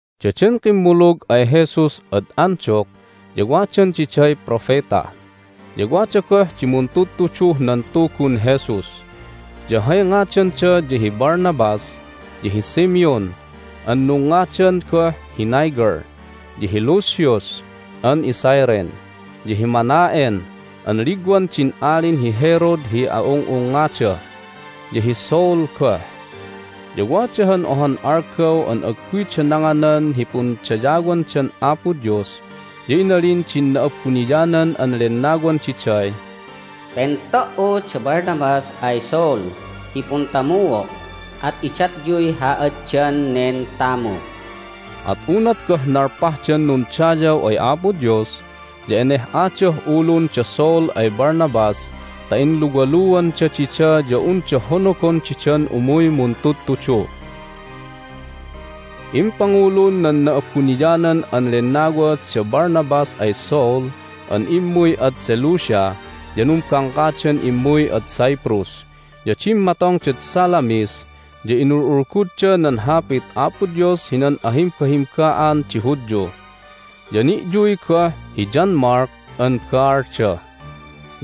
Daden kimmulug ay Jesus ad Antioch ya wadan diday propeta, ya wada goh di muntudtuduh nan Tugun Jesus. Ya hay ngadanda ya hi Barnabas, ya hi Simeon (an nungngadan goh hi Niger), ya hi Lucius (an iCyrene), ya hi Manaen (an ligwan din Alin hi Herod hi a'ung'ungngada), ya hi Saul goh. Ya wada han ohan algaw an agguyda nanganan hi pundayawandan Apo Dios, ya inalin din Na'abuniyanan an Lennawan diday, "Pento"u da Barnabas ay Saul hi puntamuo', at idatyuy haaddan nen tamu'." At unat goh nalpahdan nundayaw ay Apo Dios ya eneh'adah ulun da Saul ay Barnabas ta inluwaluanda dida ya unda honogon didan umuy muntudtudu. Hay Inayan da Paul ad Cyprus Impangulun nan Na'abuniyanan an Lennawa da Barnabas ay Saul an immuy ad Seleucia, ya numbangkadan immuy ad Cyprus. Ya dimmatongdad Salamis, ya inul'ulgud nan Hapit Apo Dios hinan ahimbahimba'an di Hudyu. Ya ni'yuy goh hi John Mark an baalda.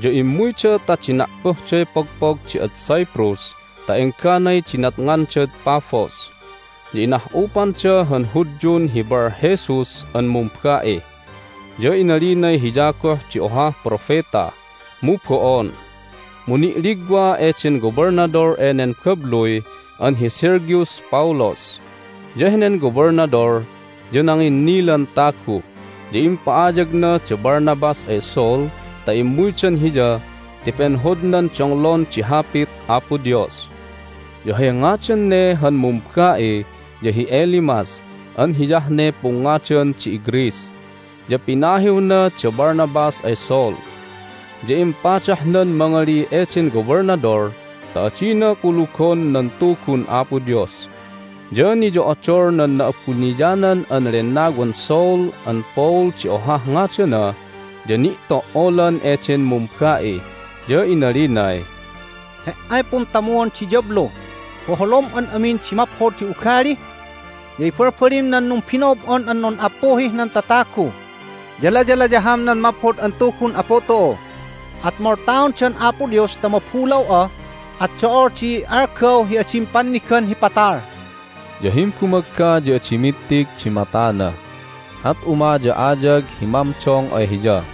Ya immuyda ta dina'puhday pogpog di ad Cyprus ta engganay nidatongdad Paphos, ya inah'upanda han Hudyun hi Barjesus an mumba'i. Ya inalinay hiya goh di ohah propeta, mu bo'on. Mu ni'ligwa eden Gobelnadol enen babluy an hi Sergius Paulus, ya henen Gobelnadol ya nanginnilan tagu. Ya impa'ayagna da Barnabas ay Saul ta immuydan hiya ti penhodnan donglon di Hapit Apo Dios. (Ya hay ngadan ne han mumba'i ya hi Elymas an hiyah ne pungngadan di iGreece.) Ya pinahiwna da Barnabas ay Saul, ya impadahnan mangali eden Gobelnadol ta adina kulugon nan Tugun Apo Dios. Ya niyo'odol nan Na'abuniyanan an Lennawan Saul an Paul di ohah ngadana, ya ni'to"olan eden mumba'i, ya inalinay, "He"ay puntamuon di diyablu! Boholom an amin di maphod hi ugali, ya ibalbalim nan numbino'ob'on an nun'appuhih nan tatagu, ya layalayaham nan Maphod an Tugun Apu tu'u! At moltaon da'an Apo Dios ta mabulaw'a, at do'ol di algaw hi adim pannigan hi patal!" Ya himbumagga ya adi mittig di matana, at umaya'ayag hi mamdong ay hiya.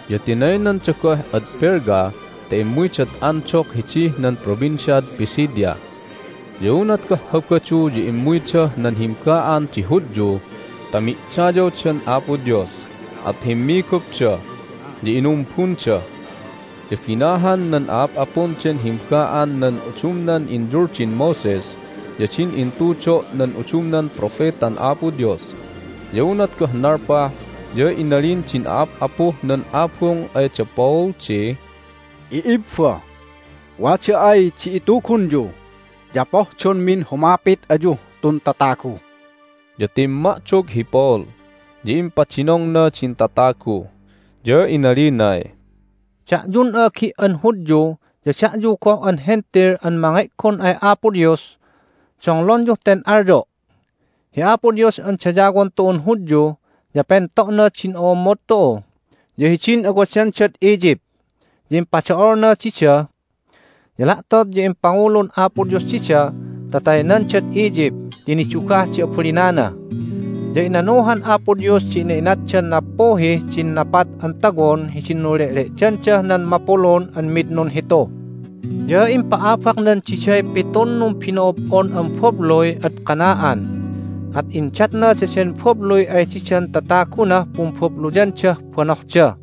Ya tinaynanda goh ad Perga ta immuydad Antioch hidih nan Provinciad Pisidia. Ya unat goh Habadu ya immuydah nan himba'an di Hudyu ta mi'dayawdan Apo Dios, at himmigupda, ya inumbunda. Ya binahan nan a'ap'apun den himba'an nan udumnan inyuldin Moses ya din intudo' nan udumnan propetan Apo Dios. Ya unat goh nalpah ya inalin din a'ap'apuh nan abung ay da Paul di, "I'ibba, wada ay di itugunyu ya pohdonmin humapit ayuh tun tatagu." Ya timma'dog hi Paul, ya impadinongna din tatagu, ya inalinay, "Da'yun a'agi' an Hudyu ya da'yu goh an Hentil an mange'gon ay Apo Dios, donglonyuh ten alyo'! Hi Apo Dios an dayawon tu'un Hudyu ya pento'na din o'ommod tu'u, ya hidin awadandad Egypt ya impado'olna dida. Ya la'tot ya impangulun Apo Dios dida ta taynandad Egypt ti nidugah di abalinana. Ya inanuhan Apo Dios di ina'inatdan nappuhih din napat an tawon hidin nunle'le'dandah nan mapulun an mid nunhitu. Ya impa'abaknan diday pitun numbino'ob'on an babluy ad Canaan, at indatna daden babluy ay didan tatagunah pumbabluyandah banohda.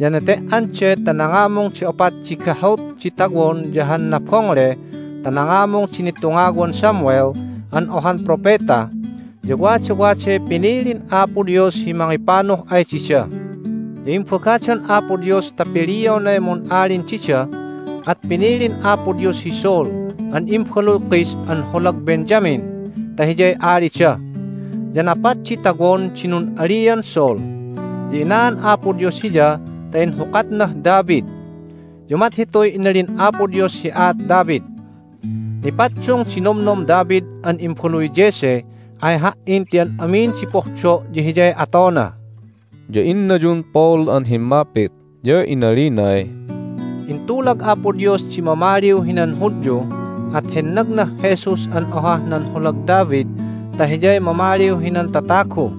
Ya nete"an de ta nangamung di opat di gahut di tawon ya han nabongle ta nangamung di nitungawan Samuel an ohan propeta, ya wadawaday pinilin Apo Dios hi mangipanuh ay dida. Ya imbagadan Apo Dios ta pilionay mun'alin dida, at pinilin Apo Dios hi Saul an imbaluy Kish an holag Benjamin ta hiyay alida. Ya napat di tawon di nun'alian Saul. Ya inaan Apo Dios hiya ta inhukatnah David. Ya umat hituy inalin Apo Dios hi aat David: Nipaddung di nomnom David an imbaluy Jesse ay Ha"in ti an amin di pohdo' ya hiyay atona." Ya innayun Paul an himmapit, ya inalinay, "Intulag Apo Dios di mamaliw hinan Hudyu, at hennagnah Jesus an ohah nan holag David ta hiyay mamaliw hinan tatagu.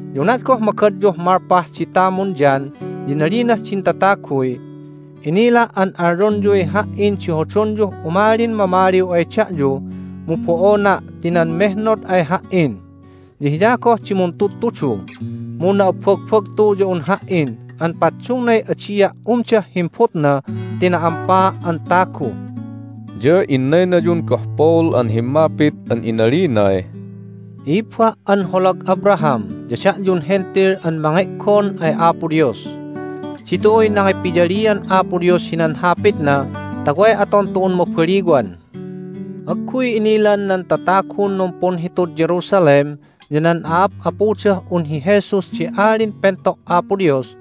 Ya unat goh magadyuh malpah di tamun John ya inalinah din tataguy, Inila' an alyonyuy ha"in di hodonyuh umalin mamaliw ay da'yu, mu bo'ona' ti nan mehnod ay ha"in. Ya Hiya goh di muntudtudu, mu na'abbagbagtu ya un ha"in an paddungnay adia' umdah himbutna ti na'ampaa' an tagu." Ya innaynayun goh Paul an himmapit an inalinay, "I'ibba' an holag Abraham ya da'yun Hentil an mange'gon ay Apo Dios, ditu'uy nangipiyalian Apo Dios hinan Hapitna ta way aton tu'un mabaliwan! Agguy innilan nan tatagun numpunhitud Jerusalem ya nan a'ap'apudah un hi Jesus di Alin Pento' Apo Dios,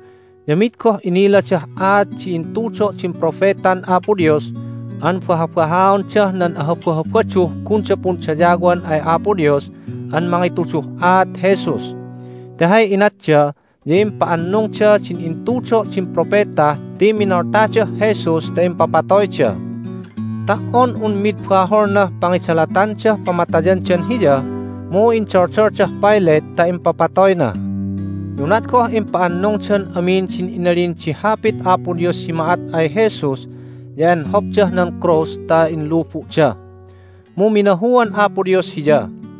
ya mid goh iniladah aat di intudo' din propetan Apo Dios an bahabahaondah nan aHabahabaduh gunda pundayawan ay Apo Dios an mangituduh aat Jesus. Ti hay inatda ya impa'annungda din intudo' din propeta ti minoltadah Jesus ta impapatoyda. Ta"on un mid baholnah pangidalatandah pamatayandan Hiya mu indoldoldah Pilate ta impapatoyna. Ya unat goh impa'annungdan amin din inalin di Hapit Apo Dios hi ma'at ay Jesus ya enhopdah nan krus ta inlubu'da. Mu minahuan Apo Dios Hiya,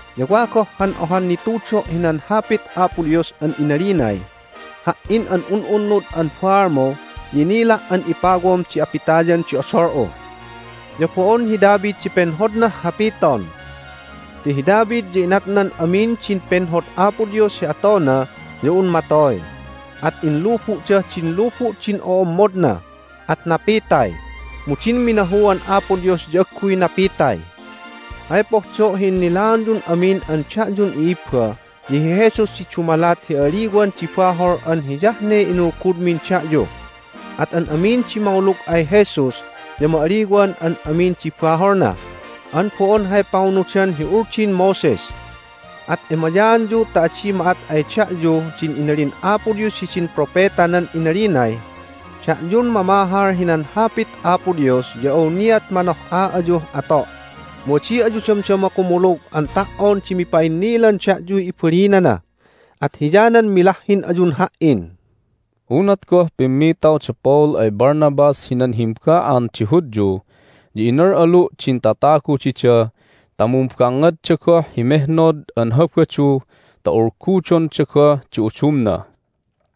Ya wa goh han ohan nitudo' hinan Hapit Apo Dios an inalinay, Ha"in an un'unnud an baalmu ya inila' an ipawam di apitayan di odol'u. Ya bo'on hi David di penhodnah hapiton. Ti hi David ya inatnan amin din penhod Apo Dios hi atona ya un matoy, at inlubu'dah din lubu' din o'ommodna, at napitay. Mu din minahuan Apo Dios ya agguy napitay. Hay pohdo' hi innilaonyun amin an da'yun i'ibba ya hi Jesus di dumalat hi a'aliwan di bahol an hiyah ne inulgudmin da'yu. At an amin di mangulug ay Jesus ya ma'aliwan an amin di baholna, an bo'on hay pangunudan hi Uldin Moses. At emayaanyu ta adi ma'at ay da'yu din inalin Apo Dios hidin propetanan inaliday, Da'yun mamahal hinan Hapit Apo Dios ya awniat manoh'a ayuh ato', mu adi ayu damdama kumulug an ta"on di mipa'innilan da'yuy ibalinana, at hiyanan milahhin ayun Ha"in." Unat goh pimmitaw da Paul ay Barnabas hinan himba'an di Hudyu ya inal'alu' din tatagu dida ta mumbangngadda goh hi mehnod an Habadu ta ulgudonda goh di udumna.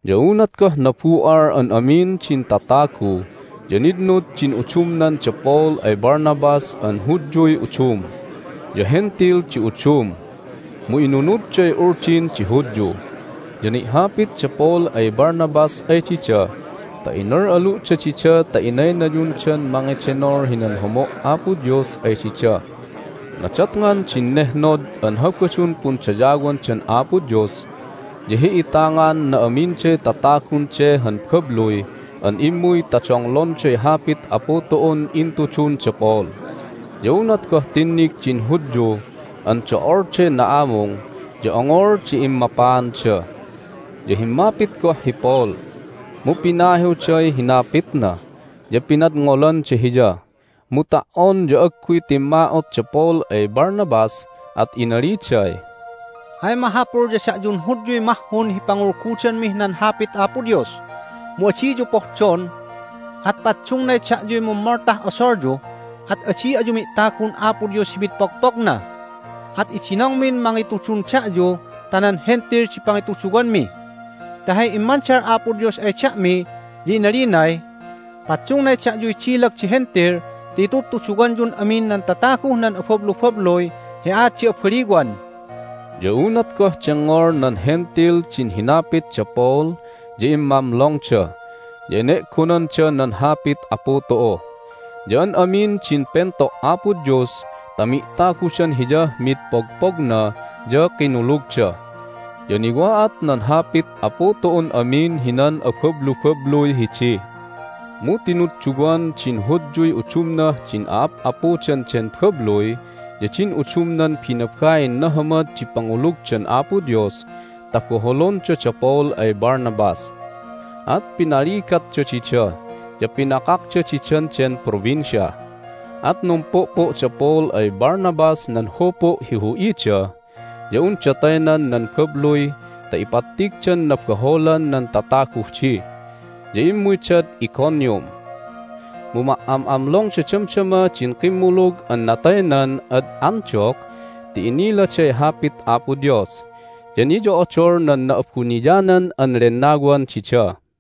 Ya unat goh nabu'al an amin din tatagu ya nitnud din udumnan da Paul ay Barnabas an Hudyuy udum, ya Hentil di udum mu inunudday Uldin di Hudyu. Ya ni'hapit da Paul ay Barnabas ay dida ta inal'alu'da dida ta inaynayundan mangedenol hinan homo' Apo Dios ay dida. Nadatngan din nehnod an Habadun pundayawandan Apo Dios ya hi'itangan na'aminday tatagun de han babluy an immuy ta donglonday Hapit Apu tu'un intudun da Paul. Ya unat goh tinnig din Hudyu an do'olday na'amung ya ongol di immapaanda. Ya himmapit goh hi Paul, mu pinahiwday hinapitna, ya pinadngolanda hiya. Mu ta"on ya agguy timma'ot da Paul ay Barnabas, at inaliday, "Hay mahapul ya da'yun Hudyuy mahhun hi pangulgudanmih nan Hapit Apo Dios. Mu adiyu pohdon, at paddungnay da'yuy mummoltah odolyu, at adi ayu mi'tagun Apo Dios hi mid pogpogna. At idinongmin mangitudun da'yu ta nan Hentil di pangituduwanmi. Ti hay immandal Apo Dios ay da'mi ya inalinay, Paddungnay da'yuy dilag di Hentil ti itudtuduwanyun amin nan tataguh nan abablubabluy hi aat di abaliwan." Ya unat goh dengngol nan Hentil din hinapit da Paul ya immamlongda, ya ene'gonanda nan Hapit Apu tu'u. Ya an amin din pento' Apo Dios ta mi'tagudan Hiyah mid pogpogna ya kinulugda. Ya niwa'at nan Hapit Apu tu'uh amin hinan abablubabluy hidi. Mu tinudduwan din Hudyuy udumnah din a'ap'apudan den babluy ya din udumnan binabain nahamad di pangulugdan Apo Dios ta boholonda da Paul ay Barnabas. At pinaligatda dida, ya pinakakda didan den provincia. At numpu'pu' da Paul ay Barnabas nan hupu' hi hu'ida ya unda taynan nan babluy ta ipattigdan nabaholan nan tataguh di, ya immuydad Iconium. Mu ma"am'amlongda damdama din kimmulug an nataynan ad Antioch ti iniladay Hapit Apo Dios, ya niyo'odol nan Na'abuniyanan an Lennawan dida.